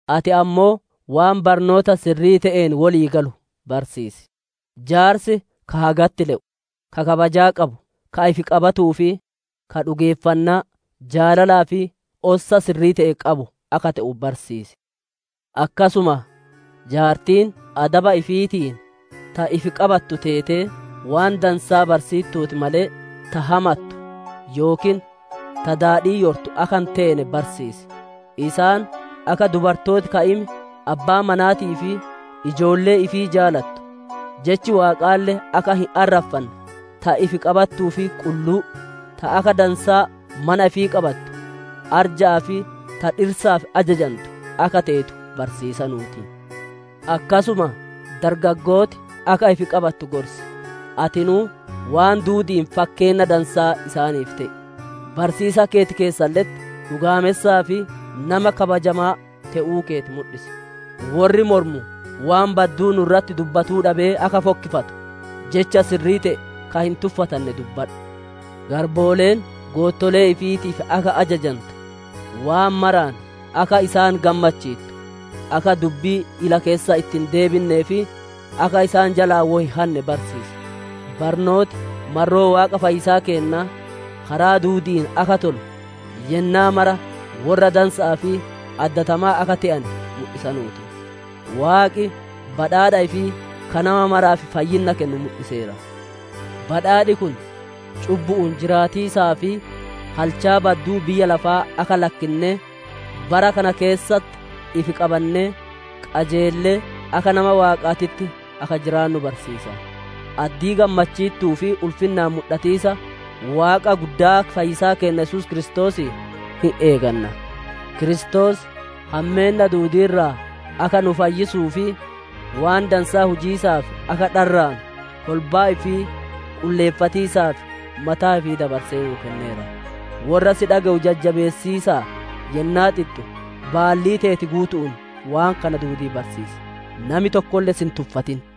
Ati ammoo waan barnoota sirrii te'een wolii galu barsiisi. Jaarsi ka hagatti le'u, ka kabajaa qabu, ka ifi qabatuu fi ka dhugeeffannaa, jaalalaa fi ossa sirrii te'e qabu akka te'u barsiisi. Akkasuma jaartiin adaba ifiitiin ta ifi qabattu teetee, waan dansaa barsiittuutii malee, ta hamattu yookiin ta daadhii yortu akka hin teene barsiisi. Isaan, akka dubartooti ka'im abbaa manaatii fi ijoollee ifii jaalattu, Jechi Waaqaalle akka hin arraffanne, ta ifi qabattuu fi qulluu, ta akka dansaa mana ifii qabattu, arja'aa fi ta dhirsaaf ajajantu akka teetu barsiisanuu ti. Akkasuma dargaggooti akka ifi qabattu gorsi. Atinuu waan duudi'iin fakkeenna dansaa isaaniif te'i. Barsiisiisa keeti keessalle'etti dhugaamessaa fi nama kabajamaa te'uu keeti mudhisi. Worri mormu waan badduu nu irratti dubbatu dhabee akka fokkifatu, jecha sirrii te'e ka hin tuffatanne dubbadhu. Garbooleen goottolee ifiitiif akka ajajantu, waan maraan akka isaan gammachiittu, akka dubbii ila keessa itti hin deebinnee fi, akka isaan jalaa wo hin hanne barsiisi. Barnooti marroo Waaqa fayyisaa keennaa, karaa duudi'iin akka tolu yennaa mara worra dansa'aa fi addatamaa akka te'ane mudhisanuu ti. Waaqi badhaadha ifii ka nama maraaf fayyinna kennu mudhiseera. Badhaadhi kun cubbu'uun jiraatiisaa fi halchaa badduu biyya lafaa akka lakkinnee, bara kana keessatti ifi qabannee, qajeellee, akka nama Waaqaatitti akka jiraannu barsiisa. Addii gammachiittuu fi ulfinnaan mudhatiisa Waaqa guddaa fayyisaa keenna Yesuus Kiristoosii hin eeganna. Kiristoos hammeenna duudii irraa akka nu fayyisuu fi waan dansaa hujiisaaf akka dharraanu, kolbaa ifii qulleeffatiisaaf mataa ifii dabarsee nuu kenneera. Worra si dhage'u jajjabeessaa yennaa xixxu, baallii teeti guutu'uun waan kana duudii barsiisi. Nami tokkolle si hin tuffatin.